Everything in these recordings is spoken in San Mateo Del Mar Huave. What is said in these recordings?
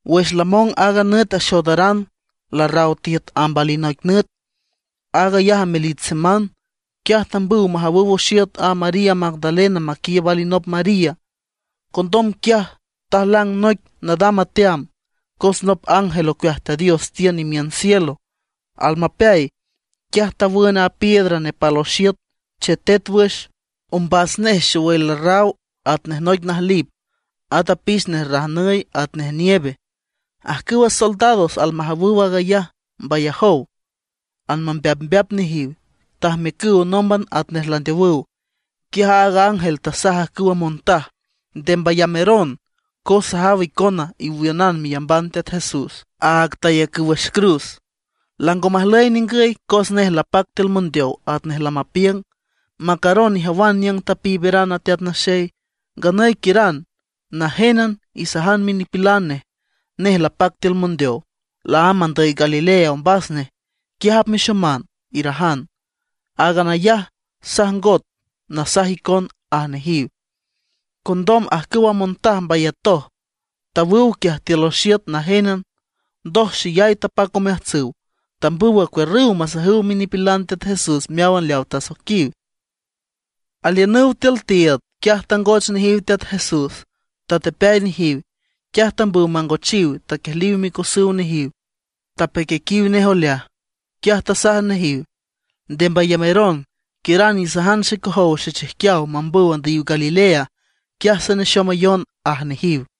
Wüx lamong aaga nüt axoodaran, larraw tiüt amb alinoic nüt, aag ayaj amelich seman; quiaj tambüw majawüw oxiüt a María Magdalena maquiiüb alinop María. Condom quiaj tajlang noic nadam ateam, cos nop ángel ocueaj Teat Dios tiün imiün cielo. Almapeay, quiaj tawün a piedra nepal oxiüt, chetet wüx. Ombas nej xowüy larraw atnej noic najlip, at apix nej rajnüy atnej nieve. Ajcüwa soldados almajawüw aag ayaj mbayajow, anmambeapmbeap nejiw, tajmiücüw nómban atnej landeowüw. Quiaj aaga ángel tasaj ajcüwa montaj: ―Nde mbayameron, cos sajaw icon iwiünan meyamban Teat Jesús, áag tayacüw wüx cruz. Lango majlüy ningüy cos nej lapac tiül mondeow atnej lamapiüng. Macaron ijawan niüng tapiiberan a Teat Naxey. Nganüy quiüran najenjénan, isajan minipilan nej: “Nej lapac tiül mondeow, laámb andüy Galilea ombas nej, quiaj apmexoman”, irajan. Áagan ayaj sajngot nasaj icon ―aj nejiw. Condom ajcüwa montaj mbayatoj, tawüw quiaj tiül oxiüt najénan; ndoj xeyay tapac omeajtsüw. Tambüw acuiürrüw masajüw minipilan Teat Jesús meáwan leaw tasoiquiw. Aliünüw tiül tiiüd, quiaj tangoch nejiw Teat Jesús, tatepeay nejiw. Quiaj tambüw mangochiw, taquiejliw micosüw nejiw, tapequiequiw nej oleaj. Quiaj tasaj nejiw: ―Nde mbayameron. Quiüran isajan xecojow xechijquiaw mambüw andüyiw Galilea, quiaj sanexomayon ―aj nejiw.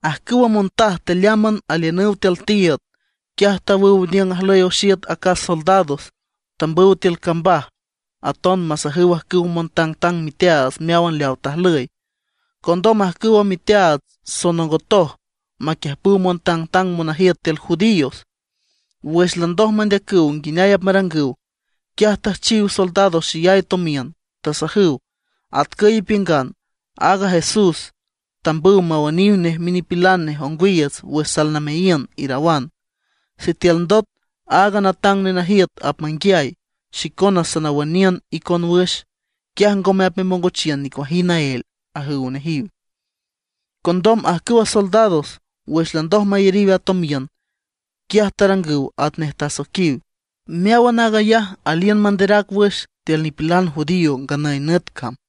Ajcüwa montaj tealeámban aliünüw tiül tiiüd, quiaj tawüw niüng ajlüy oxiüt acas soldados. Tambüw tiül cambaj aton masajüw ajcüwa montangtang miteaats meáwan leaw tajlüy. Condom ajcüwa miteaats sonongotoj maquiüjpüw montangtang monajiüt tiül judíos. Wüx landoj mandeacüw nguineay apmarangüw, quiaj tüjchiw soldados xeyay tomiün. Tasajüw: ―Atcüy ipiüngan: “Aaga Jesús, tambüw mawüniw nej minipilan nej ongwiiüts wüx salnameayiün”, irawan. Sitiül ndot aaga natang nenajiüt apmanguiay, xicona sanawüniün icon wüx, quiaj ngome apmemongochiün nicuajind naél ―ajüw nejiw. Condom ajcüwa soldados, wüx landoj mayariw a tomiün, quiaj tarangüw atnej tasoiquiw. Meáwan aag ayaj aliün manderac wüx tiül nipilan judío nganüy nüt cam.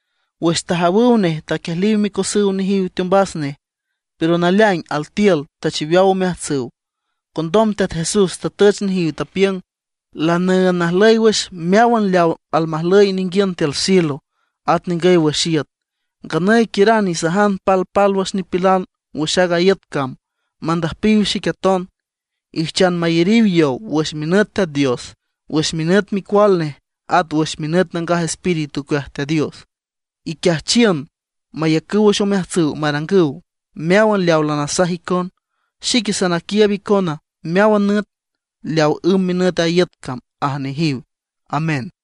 Wüx tajawüw nej taquiejliw micosüw nejiw teombas nej; pero naleaing altiül tachiweaw omeajtsüw. Condom Teat Jesús tatüch nejiw, tapiüng: ―Lanüünd najlüy wüx meáwan leaw almajlüy ninguiün tiül cielo, at ningüy wüx iüt. Nganüy quiüran isajan palpálwüx nipilan wüx aaga iüt cam mandüjpiw xic aton. Ijchan mayariw yow wüx minüt Teat Dios, wüx minüt Micual nej, at wüx minüt Nangaj Espíritu ocueaj Teat Dios. Iquiajchiün mayacüw wüx omeajtsüw marangüw meáwan leaw lanasaj icon; xique sanaquiiüb icona meáwan nüt, leaw ümb minüt a iüt cam ―aj nejiw. Amén.